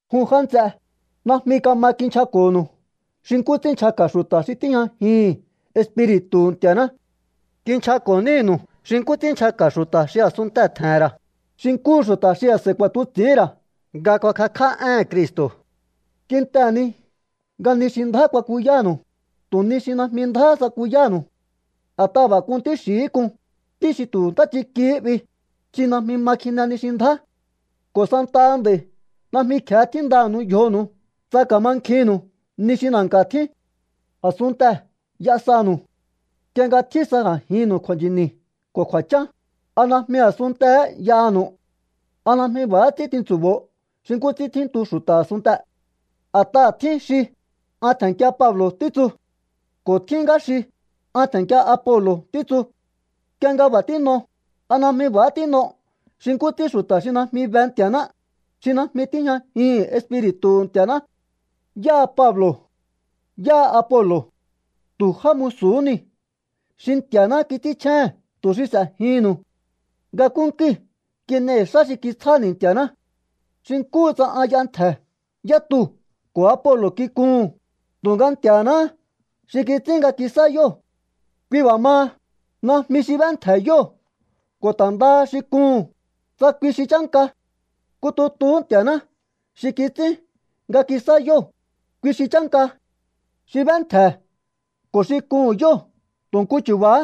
Jun já nts'e, najmi kama kinchjako̱nu̱u xi nkú ts'ín nchjaka̱ xu̱ta̱ xi tíjñajihi̱n Espiri̱tu̱hu̱ Nti̱a̱ná. Kinchjako̱ nínu̱u xi nkú ts'ín nchjaka̱ xu̱ta̱ xi a̱sunntee̱ tje̱he̱n ra̱, xi nkúhu xu̱ta̱ xi a̱s'a̱i kuakatuts'i̱hín ra̱ nga kuakakj'á éhe̱n Cristo̱. Kintehe̱ ni nga ni xi ndjá kuakuyánu̱u, tu̱ ni xi najmi ndjáhá tsakuyánu̱u. A̱t'aha̱ b'a̱ k'un ntí xi̱hí k'un, ntí xi tu̱ ntáchikihí 'bi, xi najmi ma kjine ni xi ndjá. Ko̱ santaha nd'a̱i̱ najmi kje̱e tjíndanu̱u yjonu̱u tsa ka̱mankjinnu̱u ni xi na̱nka̱ tjín. A̱sunntee̱ y'a sanu̱u. Nk'ie nga tjín sa a̱jinnu̱u kju̱a̱nchi̱ni̱ ko̱ kju̱a̱chán, ¿a najmi a̱sunntee̱hé y'aha̱nu̱u? ¿A najmi b'a̱há ts'ín tintsu̱bo̱o xi nkú ts'ín tjíntu xu̱ta̱ a̱sunntee̱? A̱t'aha̱ tjín xi: “An tje̱nnkia Pablo̱”, títsu ko̱ tjín ngá xi: “An tje̱nnkia Apolo̱”, títsu. Nk'ie nga b'a̱ tín'o, ¿a najmi b'a̱há tín'o xi nkú ts'ín xu̱ta̱ xi najmi be Nti̱a̱ná, xi najmi tíjñajihi̱n Espiri̱tu̱hu̱ Nti̱a̱ná? ¿Yáha Pablo̱? ¿Yáha Apolo̱? Tu̱ já musu̱hú niu̱ xi Nti̱a̱ná kits'ínchjéhe̱n tu̱ xi s'e̱jihi̱nnu̱u. Nga nkúnkúi̱ kin'ei̱ xá xi kitsjáni̱ Nti̱a̱ná. Xi nkúhu tsa an y'entje̱ yá tuu̱ ko̱ Apolo̱ kikuhu̱n, tu̱nga Nti̱a̱náhá xi kits'ín nga kisá yóo̱. Kui b'a̱ maha, najmi xi b'éntje̱ yóo̱ ko̱ ta̱ ndaha xi kuhu̱n, tsa kui xi chánka. Nku tutuhú Nti̱a̱ná xi kits'ín nga kisá yóo̱, kui xi chánka. Xi b'éntje̱ ko̱ xi kuhu̱n yóo̱ tu̱ nku chu̱ba̱há.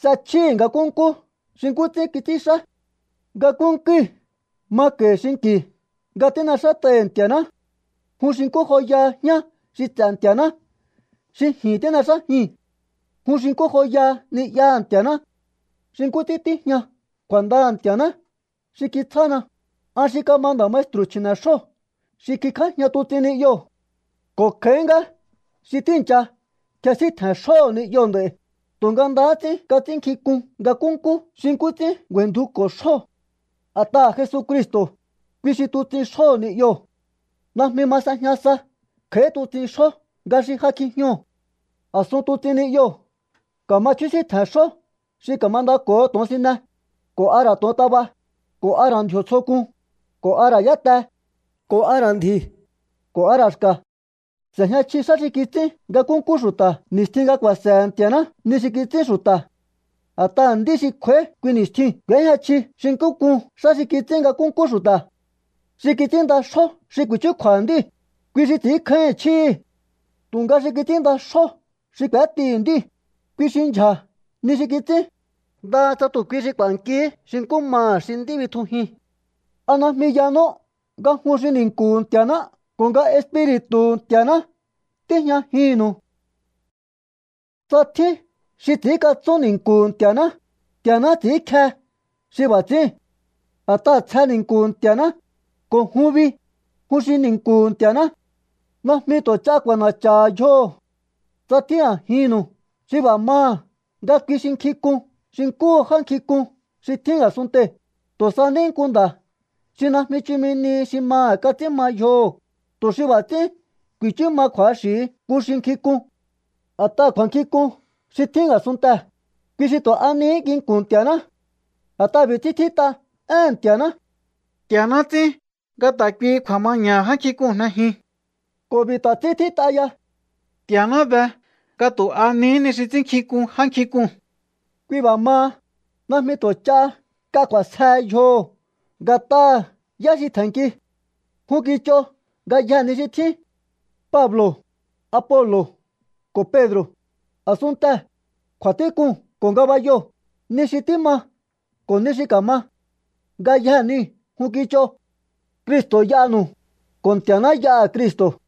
S'e̱chjíhi̱ nga nkúnkú xi nkú ts'ín kits'ínxá. Nga nkúnkúi̱ mako̱i̱ xinki̱ nga tín'exát'ai̱hi̱ Nti̱a̱ná. Jun xi nkú joyaha jñá xi ts'e̱ Nti̱a̱ná xi ji̱n tín'exájii̱n. Jun xi nkú joyaha ni'yaha̱ Nti̱a̱ná. Xi nkú ts'ín tíjña kju̱a̱ndaha̱ Nti̱a̱ná xi kitsjána, an xi kama nda̱ maestru̱ chji̱ne̱xjó xi kingjájña tuts'in ni'yoo̱. Ko̱ kj'a̱í ngá xi tíi̱ncha kjesíntje̱n xjóho̱ ni'yoo̱ nd'a̱i̱, tu̱nga ndahá ts'ín kats'ínnkjink'un nga nkúnkú xi nkú ts'ín ngju̱a̱i̱ndjuko̱ xjóo̱. A̱t'aha̱ Jesucristo̱, kui xi tuts'in xjóho̱ ni'yoo̱. Najmi ma s'ejña sa kj'a̱í tuts'in xjó nga xi ja kjijñoo̱. A̱sun tuts'in ni'yoo̱ ka̱ma chjúsíntje̱n xjó xi ka̱mandako̱ho to̱onsine, ko̱ a ra̱ to̱ontaba, ko̱ a ra̱ ndji̱o̱ tsjo k'un, ko̱ a ra̱ yáte, ko̱ a ra̱ ndji̱, ko̱ a ra̱ xka̱. S'e̱jña chji xá xi kits'ín nga nkúnkú xu̱ta̱ ni̱stjin nga ku̱a̱se̱he̱ Nti̱a̱ná ni xi kits'ín xu̱ta̱. A̱t'aha̱ nd'í xi kj'u̱a̱í kui ni̱stjiu̱n k'u̱éjña chji xi nkú k'un xá xi kits'ín nga nkúnkú xu̱ta̱. Xi kits'ínnda xjó xi ku̱i̱chúkju̱a̱ha̱ nd'íu̱, kui xi ts'i̱ínkjáíhi̱n chjíhi̱. Tu̱nga xi kits'ínnda xjó xi k'u̱étihi̱ nd'íu̱, kui xi ndyja̱ ni xi kits'ín, ndaha tsa tu̱ kui ku̱a̱nkihí xi nkú maha̱ xi nd'í bitjujin. ¿A najmi yanú nga jun xi ni̱nku̱hu̱ Nti̱a̱ná ko̱ nga Espiri̱tu̱hu̱ Nti̱a̱ná tíjñajinnu̱u? Tsa tjín xi ts'i̱ínkatsún ni̱nku̱hu̱ Nti̱a̱ná, Nti̱a̱ná ts'i̱ínkje xi b'a̱ ts'i̱íu̱n. A̱t'aha̱ tsje ni̱nku̱hu̱ Nti̱a̱ná, ko̱ jun bi, jun xi ni̱nku̱hu̱ Nti̱a̱ná. Najmi tu̱ ch'a k'u̱a̱na̱cha̱ha̱ yjoho̱. Tsa tjín a̱jinnu̱u xi b'a̱ maha̱ nga kui xi nkjink'un xi nkúhu já nkjink'un xi tjín a̱sunntee̱, tu̱ sa ní nku nda̱ xi najmi chumi nihi xi maha̱ kats'ín ma yjoho̱, tu̱ xi b'a̱ ts'ín ku̱i̱chú ma kju̱axi̱hi nku xi nkjink'un. A̱t'aha̱ kju̱a̱nkjink'un xi tjín a̱sunntee̱, kui xi tu̱ a nihí nginku̱n Nti̱a̱ná. A̱t'aha̱ b'i̱ ts'ín tjít'a éhe̱n Nti̱a̱ná: “Nti̱a̱ná ts'ín nga ta̱ kuihi kju̱a̱maña̱ha̱ já nkjink'uu̱n jnejin.” Ko̱ b'i̱ ta̱ ts'ín tjít'a ya: “Nti̱a̱ná be nga tu̱ a nihí ni xi ts'ínnkjink'un já nkjink'uu̱n.” Kui b'a̱ maha, najmi tu̱ ch'a nk'a k'u̱a̱sjehe yjoho̱ nga̱t'aha̱ yá xi tje̱nnki. Jun kich'o ngayjee̱ ni xi tjín. Pablo̱, Apolo̱ ko̱ Pedro̱, a̱sunntee̱, kju̱a̱tík'uu̱n ko̱ ngabayoo̱, ni xi tíma ko̱ ni xi ka̱ma, ngayjee̱ niu̱ jun kich'o. Cristo̱ y'anu̱u, ko̱ Nti̱a̱ná y'aha̱ Cristo̱.